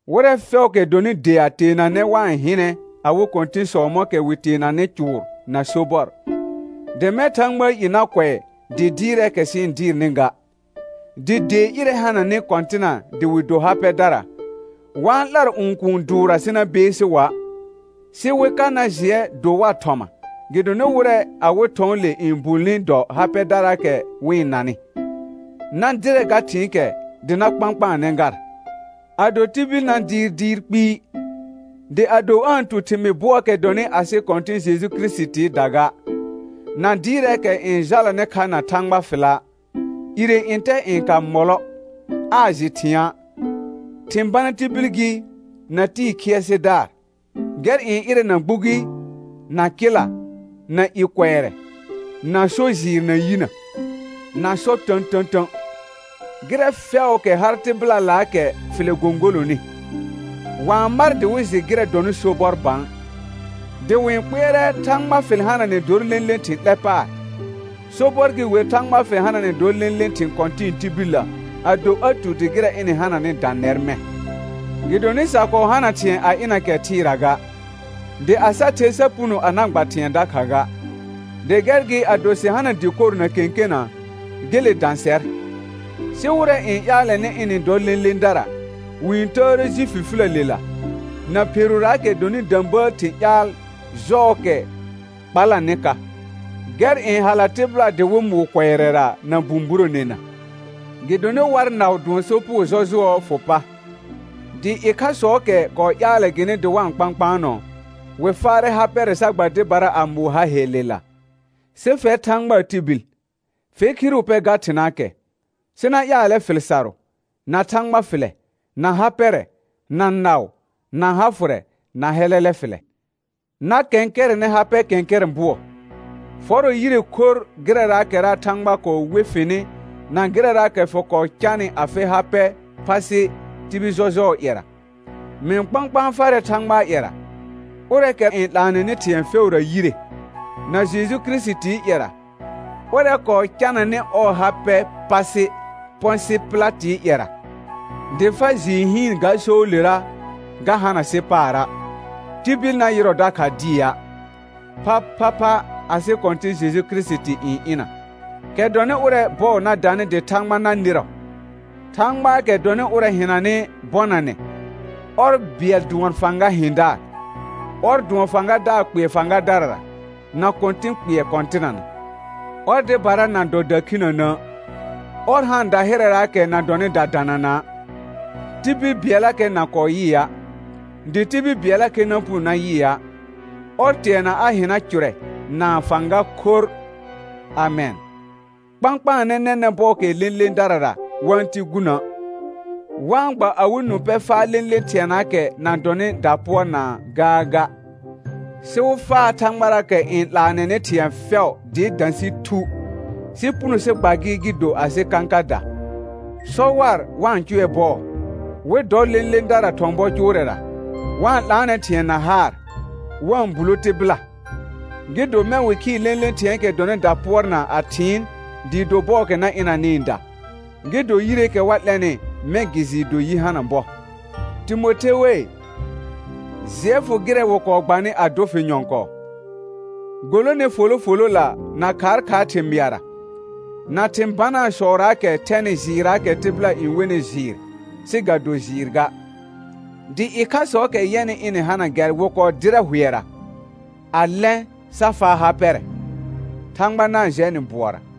Wɩrɛ fɛʋʋkɛ dɔnɩ dea teenanɛ wa-n hɩnɛ awɩ kɔ̃tɩ̃sɔ mɔ̃kɛ wɩ teenanɩ cʋʋr na sobɔr, dɩ mɛ̃ Thãgbaa i na kʋɛ dɩ dɩɩrɛɛkɛ sɩ-n dɩɩrnɩ ga. Dɩ dee ƴɩrɛ hananɩ kɔ̃tɩna dɩ wɩ do ha pɛdara, wa-n 'lar õkũu dʋʋrra sɩ na beesi wa', sɩ wɩ ka na jɩɛ do war thɔma gɩdonɩ wɩrɛ awɩ thɔ̃ɔle n bulni dɔ ha pɛdaraakɛ wɩ-n nanɩ. Na dɩrɛ ga thɩ̃ɩkɛ dɩ na kpãkpaanɛ gar. Ado tibil na dɩɩr dɩɩr kpɩɩ, dɩ ado aa-n tu thɩmɩɩ bʋɔɔkɛ dɔnɩ asɩ Kɔ̃tɩ̃ Jeju Kirisitiida ga, na dɩɩrɛɛkɛ n jalanɩ kha na Thãgba fɩla', ire ntɛ n ka mɔlɔ, aa jɩ thɩ̃a'; thɩ̃ bana tibil gɩ, na tɩɩ khɩɛsɩdaar, gɛr n ɩrɛna gbugi, na kɩla, na i kʋɛrɛ, na so jɩɩr na yinə, na sɔ tə̃tə̃tə̃. Gɩrɛ fɛʋʋkɛ har tɩbɩlalaakɛ fɩlɛ gõgolonɩ, wa-n mar dɩ wɩ jɩ gɩrɛ dɔnɩ sobɔr bã, dɩ wɩ-n kpɩɛrɛ Thãgba fɩl hananɛ dor lẽle thɩ̃ 'lɛ paar. Sobɔr gɩ wer Thãgba fɩl hananɛ dor lẽle thɩ̃ kɔ̃tɩ̃ɩ tibillə ado a tu dɩ gɩrɛ ɩnɩ hananr dã nɛr mɛ̃. Gɩdonɩ sa kɔɔ hana thɩ̃ɛ a ɩna kɛ thɩɩra ga, dɩ a sa the sa puno a na gba thɩ̃ɛ dakha ga. Dɩ gɛr gɩ ado sɩ hana dɩkor na kẽkena, gele dã sɛr. Sɩ wɩrɛ n ƴaalɛnɩ ɩnɩ-n dɔ lẽledara, wɩ-n təəre ji fifiləlela, na pheruraakɛ dɔnɩ də̃bəəl thɩ̃ ƴaal jɔɔkɛ kpalanɩ ka, gɛr n hala tɩbɩla dɩ wɩ mʋʋ kʋɛrɛra na bũburonena. Gɩdonɩ war naʋ dʋɔn sopugo jɔjʋɔɔ fʋ pa; dɩ ɩkhasɔɔkɛ kɔɔ ƴaalɛ gɩnɩ dɩ wa-n kpãkpaanɔ, wɩ faarɛ ha pɛrɛ sa gba dɩbara a mʋʋ ha hellela. Sɩ fɛr Thãgbaa tibil, fe khiru pɛ ga thɩnaakɛ, sɩ na ƴaalɛ fɩl sarʋ, na Thãgba fɩlɛ, na ha pɛrɛ, na naʋ, na ha fʋrɛ, na hɛlɛlɛ fɩlɛ. Na kɛ̃kɛrɛnɛ ha pɛ kɛ̃kɛrɛ̃ bʋɔ. Fɔrɔ yire khorr gɩrɛraakɛra Thãgba kɔɔ we fɩnɩ na gɩrɛraakɛ fɩ kɔɔ canɩ afɩ ha pɛ pasɩ tibil jɔjʋɔɔ ƴɛra. Mɩ-n kpãkpãa farɛ Thãgbaa ƴɛra, ʋrɛɛkɛ n 'laanɛnɩ thɩ̃ɛ fɛʋra yire, na Jeju Kirisitii ƴɛra, ʋrɛ kɔɔ cananɩ ɔɔ ha pɛ pasɩ Pɔ̃sɩ Pɩlatɩɩ ƴɛra, dɩ fa jɩɩ hɩɩn ga soolera ga hana sɩ paara', tibil na yɩrɔ dakha dɩa', phaphapha asɩ Kɔ̃tɩ̃ Jeju Kirisiti n ɩna, kɛ dɔnɩ ʋrɛ̃ bɔɔ na danɩ dɩ Thãgba na nɩrɔ, Thãgbaakɛ dɔnɩ ʋrɛ hɩnanɩ bɔnanɛ, ɔr bɩɛl dʋɔn Fãga hɩ̃daar, ɔr dʋɔn Fãgadaar kpɩɛ fãgadarara, na Kɔ̃tɩ̃ kpɩɛ kɔ̃tɩnana, ɔr dɩbara na dɔ dakhinənə', ɔr haan dahɩrɛraakɛ na dɔnɩ dadanana'; tibil bɩɛllakɛ na kɔɔ yɩa', dɩ tibil bɩɛllakɛ na puno na yɩa'. Ɔr teana a hɩna cʋrɛ na fãga khorr. Amɛn. Kpãkpaanɛ nɛnɛ̃ bɔɔkɛɛ lẽledarara wa-n ti gunə', wa-n gba awɩ nũ pɛ faa lẽle thɩɛnaakɛ na dɔ̃nɩ dapʋɔrnaa gaaga, sɩ wɩ faa Thãgbaraakɛ n 'laanɛnɩ thɩ̃ɛ fɛ̃ʋ dɩɩ dã sɩ thu, sɩ puno sɩ gba gɩ gɩ do asɩ kãkada. Sɔ war wa-n cʋɛ bɔɔ, wɩ dɔ lẽledara thɔ̃ bɔ cnʋrɛra, wa-n 'laanɛ thɩ̃ɛ na haar, wa-n bulo tɩbɩla; gɩ do mɛ̃ wɩ khɩɩ lẽle thɩ̃ɛɛkɛ dɔnɩ dapʋɔrnaa a thɩɩn dɩɩ do bɔɔkɛ na ɩnanɩɩda, gɩ do yireekɛ wa 'lɛnɩ mɛ̃ gɩ jɩɩ do yi hana bɔ. Timothe wei, jɩɛ fʋ gɩrɛ wɩ kɔɔ gbanɩ a dʋ fɩ nyɔ̃kɔɔ. Golone folo folola na khaakhaar thɩmɩara, na thɩ̃ banaasɔraakɛ thɛnɩ jɩɩrraakɛ tɩbɩla n wenɩ jɩɩr sɩ ga do jɩɩr ga; dɩ ɩkhasɔɔkɛ yɛnɩ ɩnɩ hana gɛr wɩ kɔɔ dɩrɛ hʋɛra, a lɛ̃, sa faa ha pɛrɛ. Thãgba na-n jɛ nɩ bʋɔra.